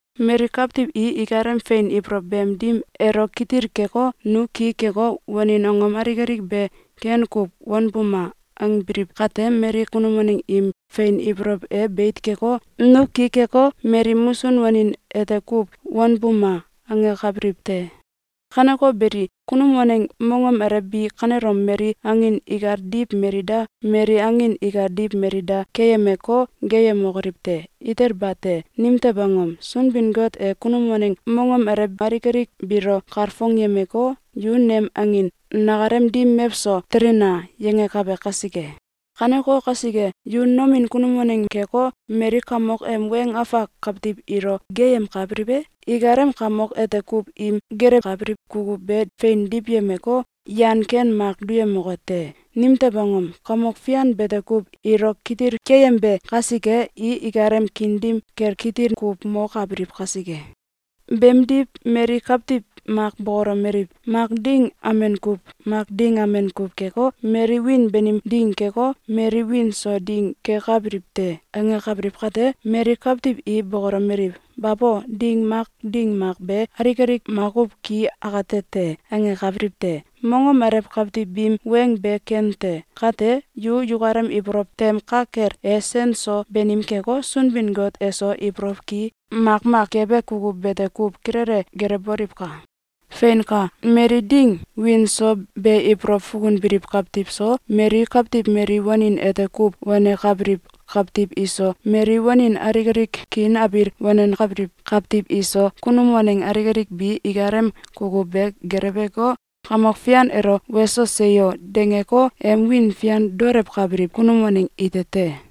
Mali kawtiw i ikalem fein ibolow beem dim elo kitil keko, “Nu ki keko, wanin angom alik alik be ken kuw wanbuma!”, angbiliw kate, mali kunum waneng im fein ibolow e beit keko, “Nu ki keko, mali musun wanin ete kuw wanbuma!”, angakabiliw te. Kaneko beli, kunum waneng mongom alew bi kanelom mali angin ikal diw mali da, mali angin ikal diw mali da, keyemeko, geeyemokoliw te! Itel bate! Nimtew angom? Sunbin-Got e kunum waneng mongom alew alik alik biilo kalfongyemeko, “Yu nem angin! Nakalem dim mewso telina!”, yangakabe kasike. Kaneko kasike, yu nomin kunum waneng keko, mali kamok em weng afak kawtiw ilo geeyemkabiliw e? Ikalem kamok ete kuw im gelewkabiliw kukuw be fein diwyemeko, yan ken mak duyemoke te. Nimtew angom? Kamok Fian bete kuw ilo kitil keyembe kasike, i akalem kiin dim kel kitil kuw mokabiliw kasike. Beemdiw mali kawtiw mak bokolomeliw: “Mak ding amen kuw, mak ding amen kuw keko, mali wiin banim ding keko, mali wiin so ding kekabiliw te!”, angakabiliw kate, mali kawtiw i bokolomeliw: “Babo! Ding mak ding mak be alik alik makuw ki akate te!”, angakabiliw te. Mongom alew kawtiw biim weng be ken te. Kate, yu yukalem ibolow tem ka kel e sen so banim keko, Sunbin-Got eso ibolow ki makmak kebe kukuw bete kuw kilele gelewboliwka! Feinka! Mali ding wiin so be ibolow fukunbiliw kawtiw so, mali kawtiw mali wanin ete kuw wanenkabiliw kawtiw iso, mali wanin alik alik kiin abil wanenkabiliw kawtiw iso, kunum waneng alik alik bi ikalem kukuw be geleweko, Kamok Fian elo “Weso! Seyo!”, dangeko, em wiin fian daolewkabiliw kunum waneng ite te.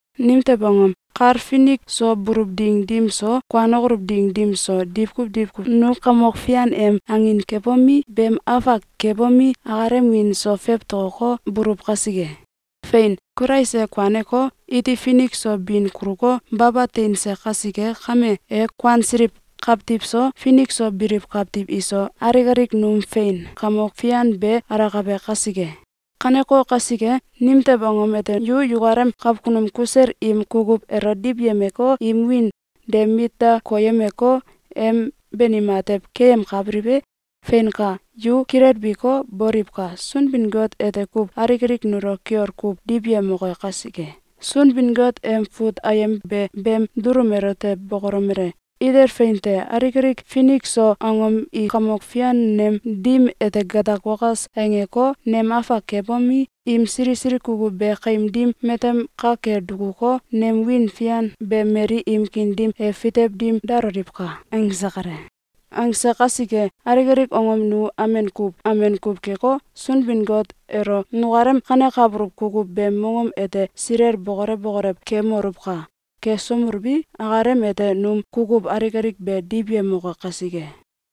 Nimtew angom? Kal finik so buluw ding dim so, kuanokoluw ding dim so, diwkuw diwkuw nu Kamok Fian em angin kebomi, beem afak kebomi, akalem wiin so fewtokoko, buluw kasike. Fein! Kulais e kuaneko, iti finik so bin kuluko, baba teinse kasike kame, e kuansiliw kawtiw so, finik so biliw kawtiw iso, alik alik num fein kamok fian ke alakabe kasike. Kaneko kasike, nimtew angom ete yu yukalem kakunum kusel im kukuw elo diwyemeko, im wiin de mit da koyemeko, em banim atew keyemkabiliw e? Feinka, yu kilelbiko, boliwka! Sunbin-Got ete kuw alik alik nulo kiol kuw diwyemoke kasike. Sunbin-Got em fut ayem be beem dulum elote bokolomele: “Itel fein te! Alik alik finik so angom i Kamok Fian nem dim ete gatak wakas angeko, nem afak kebomi, im sili sili kukuw be kaim dim matem ka kel dukuko, nem wiin fian be mali im kiin dim e fitew dim daloliwka!”, angse kale. Angse kasike, alik alik angom nu amen kuw amen kuw keko, Sunbin-Got elo nukalem kanekabuluw kukuw beem mongom ete silel bokolew bokolew kemoluwka! Kesomeluwi, akalem ete num kukuw alik alik be diwyemoke kasike.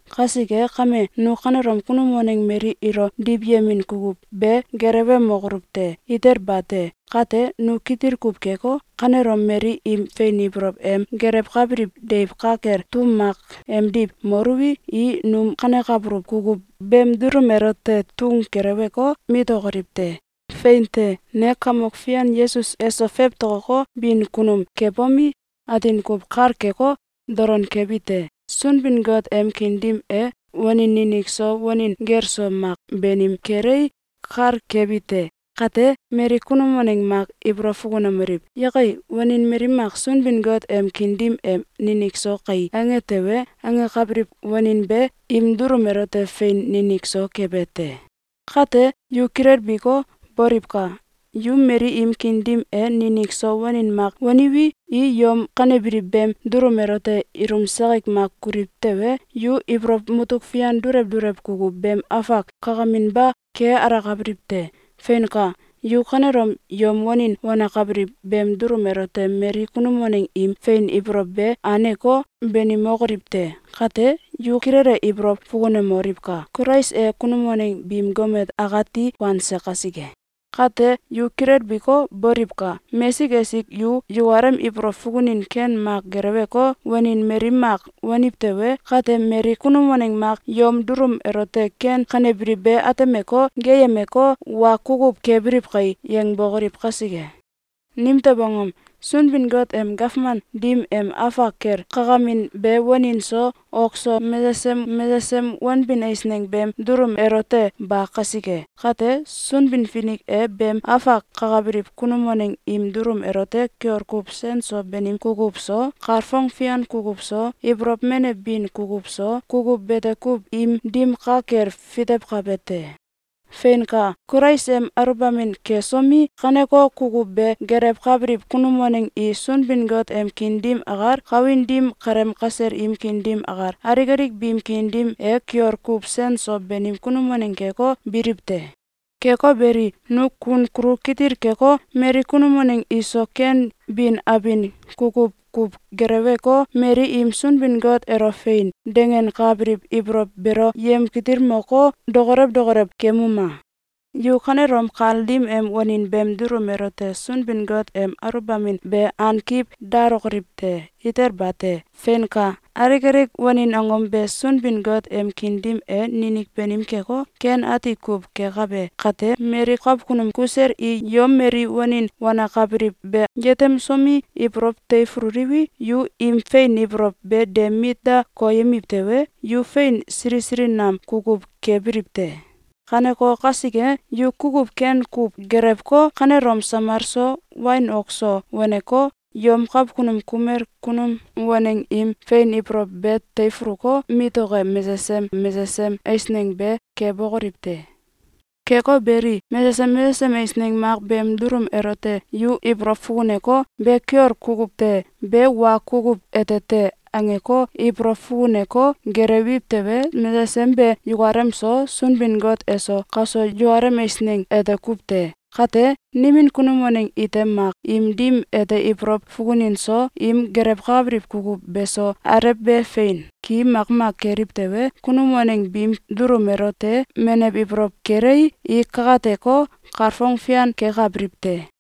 Kasike kame, nu kanelom kunum waneng mali ilo diwyemin kukuw be gelewemokoluw te! Ite bate! Kate nu kitil kuw keko, kanelom mali im fein ibolow em gelewkabiliw deiw ka kel tum mak emdiw moluwi, i num kanekabuluw kukuw beem dulum elote tun keleweko, mitokoliw te! Fein te! Ne Kamok Fian Yesus eso fewtokoko, bin kunum kebomi, atin kuw kal keko, dolon kebite: Sunbin-Got em kiin dim e wanin ninik so wanin gel so mak banim kelei, kal kebi te. Kate, mali kunum waneng mak ibolow fukunomeliw: “Yakai! Wanin mali mak Sunbin-Got em kiin dim e ninik so kai!”, ange tewe, angakabiliw wanin be im dulum elote fein ninik so kebe te. Kate yu kilelbiko, boliwka! Yu mali im kiin dim e ninik so wanin mak waniwi, i yom kanebiliw beem dulum elote ilum sakik mak kuliw tewe, yu ibolow mutuk fian dulew dulew kukuw beem afak kakaminba ke alakabiliw te. Feinka! Yu kanelom yom wanin wanakabiliw beem dulum elote mali kunum waneng im fein ibolow be aneko, banimokoliw te! Kate, yu kilele ibolow fukunemoliwka! Kulais e kunum waneng biim gomet akati kuanse kasike. Kate yu kilelbiko, boliwka! Mesik esik yu yukalem ibolow fukunin ken mak geleweko, wanin mali mak waniw tewe, kate mali kunum waneng mak yom dulum elote ken kanebiliw be atemeko, geeyemeko, “Wa kukuw kebiliw kai!”, yangbokoliw kasike! Nimtew angom? Sunbin-Got em gawman dim em afak kel kakamin be wanin so, ok so, mesesem mesesem wanbin eisneng beem dulum elote ba kasike! Kate, Sunbin-Finik e beem afak kakabiliw kunum waneng im dulum elote kiol kuw sen so banim kukuw so, kalfong fian kukuw so, ibolow menew bin kukuw so, kukuw bete kuw im dim ka kel fitewkabe te. Feinka! Kulais em aluwbamin kesomi, kaneko kukuw be gelewkabiliw kunum waneng i Sunbin-Got em kiin dim akal, kawin dim kaleem kasel im kiin dim akal, alik alik biim kiin dim e kiol kuw sen so banim kunum waneng keko, biliw te. Keko beli, nu kun kulu kitil keko, mali kunum waneng iso ken bin abin kukuw kuw geleweko, mali im Sunbin-Got elo “Fein!”, dangenkabiliw ibolow beelo yamkitilmoko, dokolew dokolew kemuma! Yu kanelom kal dim em wanin beem dulum elote Sunbin-Got em aluwbamin be ankiw dalokoliw te! Itel bate! Feinka! Alik alik wanin angom be Sunbin-Got em kiin dim e ninik banim keko, ken ati kuw kekabe kate, mali kakunum kusel i yom mali wanin wanakabiliw be yetemsomi, ibolow teifululiwi, yu im fein ibolow be de mit da koyemiw tewe, yu fein sili sili nam kukuw kebiliw te. Kaneko kasike, yu kukuw ken kuw gelewko, kanelom samal so, wain ok so, waneko, yom kakunum kumel kunum waneng im fein ibolow be teifuluko, mitoke mesesem mesesem eisneng be kebokoliw te! Keko beli, mesesem mesesem eisneng mak beem dulum elote yu ibolow fukuneko, “Be kiol kukuw te! Be wa kukuw ete te!”, angeko ibolow fukuneko gelewiw tewe, mesesem be yukalem so, Sunbin-Got eso, kaso yukalem eisneng ete kuw te. Kate, nimin kunum waneng ite mak im dim ete ibolow fukunin so, im gelewkabiliw kukuw be so, alew be fein ki makmak keliw tewe, kunum waneng biim dulum elote menew ibolow kelei, i kakateko, kalfong fian kekabiliw te.